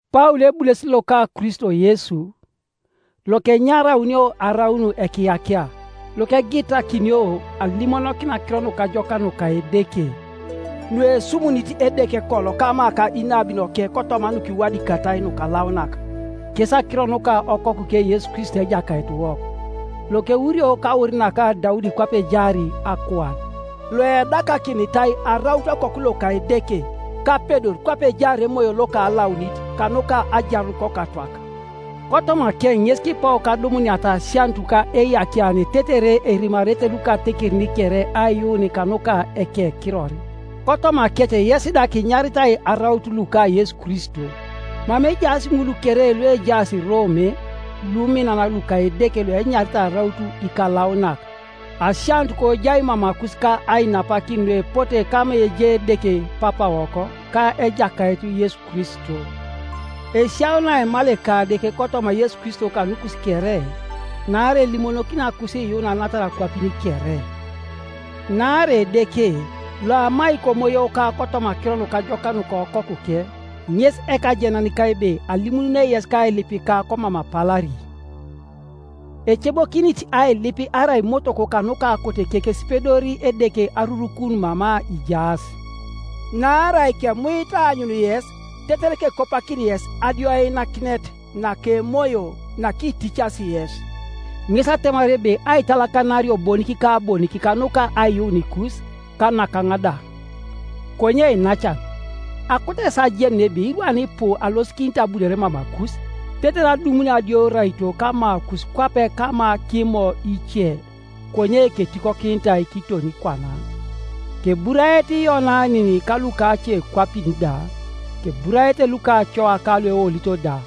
Paul ebulesit loka Kristo Yesu, Iokenyaraunio araun: ekiyakia, Iokegitakinio alimonokin Akiro Nukajokak nuka Edeke, nuesumunit Edeke kolo kama ka inabinoke kotoma nukiwadikatai nukalaunak, kes akiro nuka okokuke Yesu Kristo Ejakaitiwok, lokeurio kaur naka Daudi kwape ejaar akuan, loedakakinitai araut Okoku loka Edeke kapedor kwape ejaar Emoyo loka Alaunit, kanuka ajarun kokatwak, kotomakeŋ ŋes kipou kadumuniata asianut ka eiyakiane tetere erimarete lukatekerin kere aiyuun kanuka ekekiror, kotomakec yes da kinyaritai araut luka Yesu Kristo. Mama ejaas ŋul kere luejaas Rome luminan luka Edeke luenyaritai araut ikalaunak: Asianut kojai mamakus ka ainapakin nuepote kama ejai Edeke Papawok ka Ejakait Yesu Kristo. Esiauni aimal Ekadeke kotoma Yesu Kristo kanukus kere, naarai elimonokinio akusiiyuun anatar akwapin kere. Naarai Edeke, loamai komoyoka kotoma Akiro Nukajokak nuka Okokuke, ŋes ekajenanika ebe alimununei yes kailipika komam apalari. Ecebokinit ailip arai motoko kanuka akoteke kesipedori Edeke arurukun mama ijaas. Naarai kemuit aanyun yes tetere kekopakin yes adioinakinet naka emoyo nakiticasi yes, ŋes atemar ebe aitalakanario bonik ka bonik kanuka aiyuunikus, ka nakaŋ da. Konye iinacan, akoto yes ajenun ebe irwan ipu alosikinit abunore mamakus, tetere adumuni adioraito kamakus kwape kama kImo ice, konye ketikokinitai kiton kwana. Keburaete Iyonanin ka lukacekwapin da, keburaete lukacoa ka lueolito da: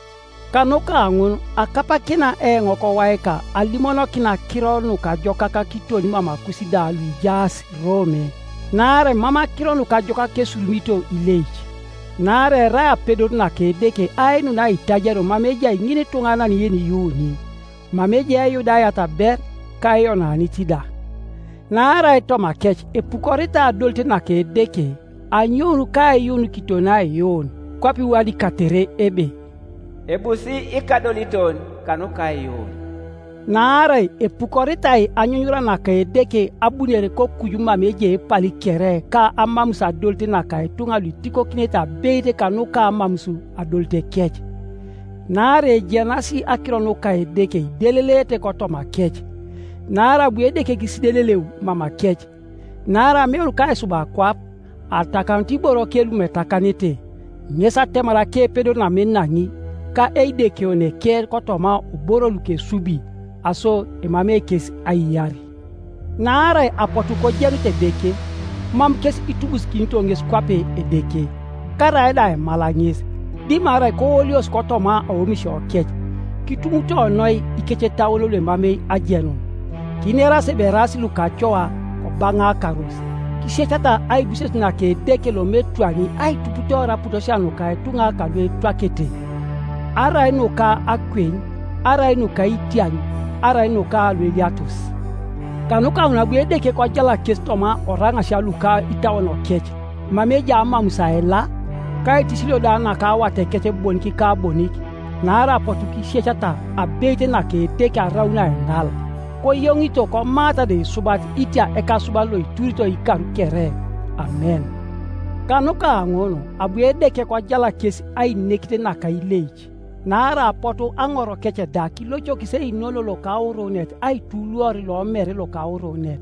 kanuka ŋun akapakina eoŋ kowaika alimonokin Akiro Nukajokak kiton mamakus da luijaas Rome. Naarai mam Akiro Nukajokak kesurumito ileic: naarai erai apedor naka Edeke ainun aitajario mama ejai ŋinituŋanan yeniyuuni, mama ejai Eyudayat ber, ka Eyonanit da. Naarai tomakec epukoritai adolit naka Edeke, anyoun kaiyuun kiton aiyuun; kwape iwadikatere ebe, “Ebusi ikadoliton kanuka aiyuun.” Naarai epukoritai anyunyura naka Edeke abunore kokuju mama ejai epali kere ka amamus adolit naka ituŋa luitikokinete abeit kanuka amamus adolitekec. Naarai ejenas akiro nuka Edeke ideleleete kotomakec, naarai abu Edeke kisideleleu mamakec. Naarai ameun kaisub akwap, atakanut iboroke lumam etakanete, ŋes atemar akepedor namam enaŋi, ka Eidekeoneke, kotoma oboro lukesubi. Aso emamei kes aiyar: naarai apotu kojenut Edeke, mam kes itubusikinito ŋes kwape Edeke, karaida aima ŋes, dimarai kooliosi kotoma aomisiokec, kitumutoroi ikecetauon luemamei ajenun. Kineras ebe eraas lukacoa, kobaŋaakaros, kisiecata aibuses naka Edeke lomam etwani aituputoor aputosia nuka ituŋa kaluetwakete, arai nuka akweny, arai nuka itiaŋ, arai nuka lueliatos. Kanuka ŋun abu Edeke kojalak kes toma oraŋasia luka itauonokec mama ejai amamus aila, ka aitisilio da naka awatekec bonik ka bonik, naarai apotu kisiecata abeit naka Edeke araun aiŋal, koyoŋito komaata da isubat itia Ekasuban loituritoi ikar kere! Amen. Kanuka ŋun abu Edeke kojalak kes ainekit naka ileic, naarai apotu aŋorokec da kilocokis einono lokaurunet aituluor lomere lokaurunet,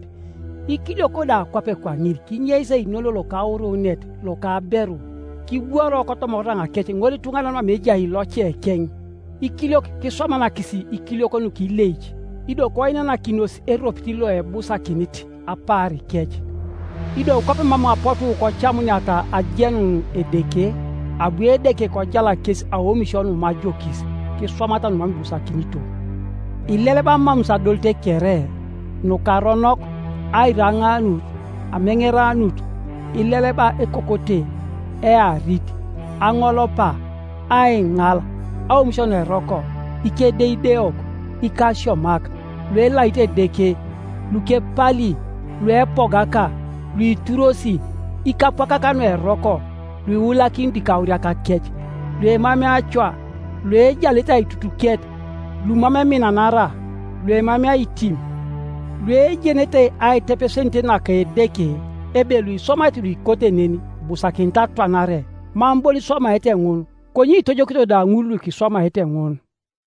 ikiliok da kwape kwaŋin kinyeis einono lokaurunet loka aberu kibworo kotoma oraŋakec ŋolituŋanan mama ejai locekeŋ, ikiliok kiswamanakis ikiliok nukileic, ido koinanakinos eropit loebusakinit apaarikec. Ido kwape mam apotu kocamuniata ajenun Edeke, abu Edeke kojalak kes aomisio numam ajokis, kiswamata numam ibusakinito. Ileleba amamus adolit kere, nukaronok, airaŋaanut, ameŋeranut; ileleba ekokote, earit, aŋolopa, aiŋal, aomisio nueroko, ikedeideok, ikasiomak, luelaito Edeke, lukepali, luepogaka, luituros, ikapwakak nueroko, luiulakinito ikauriakakec, luemamei acoa, luejalete aitutuket, lumam eminanara, luemamei aitim, luejenete aitepesenit naka Edeke, ebe luiswamaete nuikote nen ibusakinit atwanare, mam bon iswamaete ŋun, konye itojokito da ŋul lukiswamaete ŋun.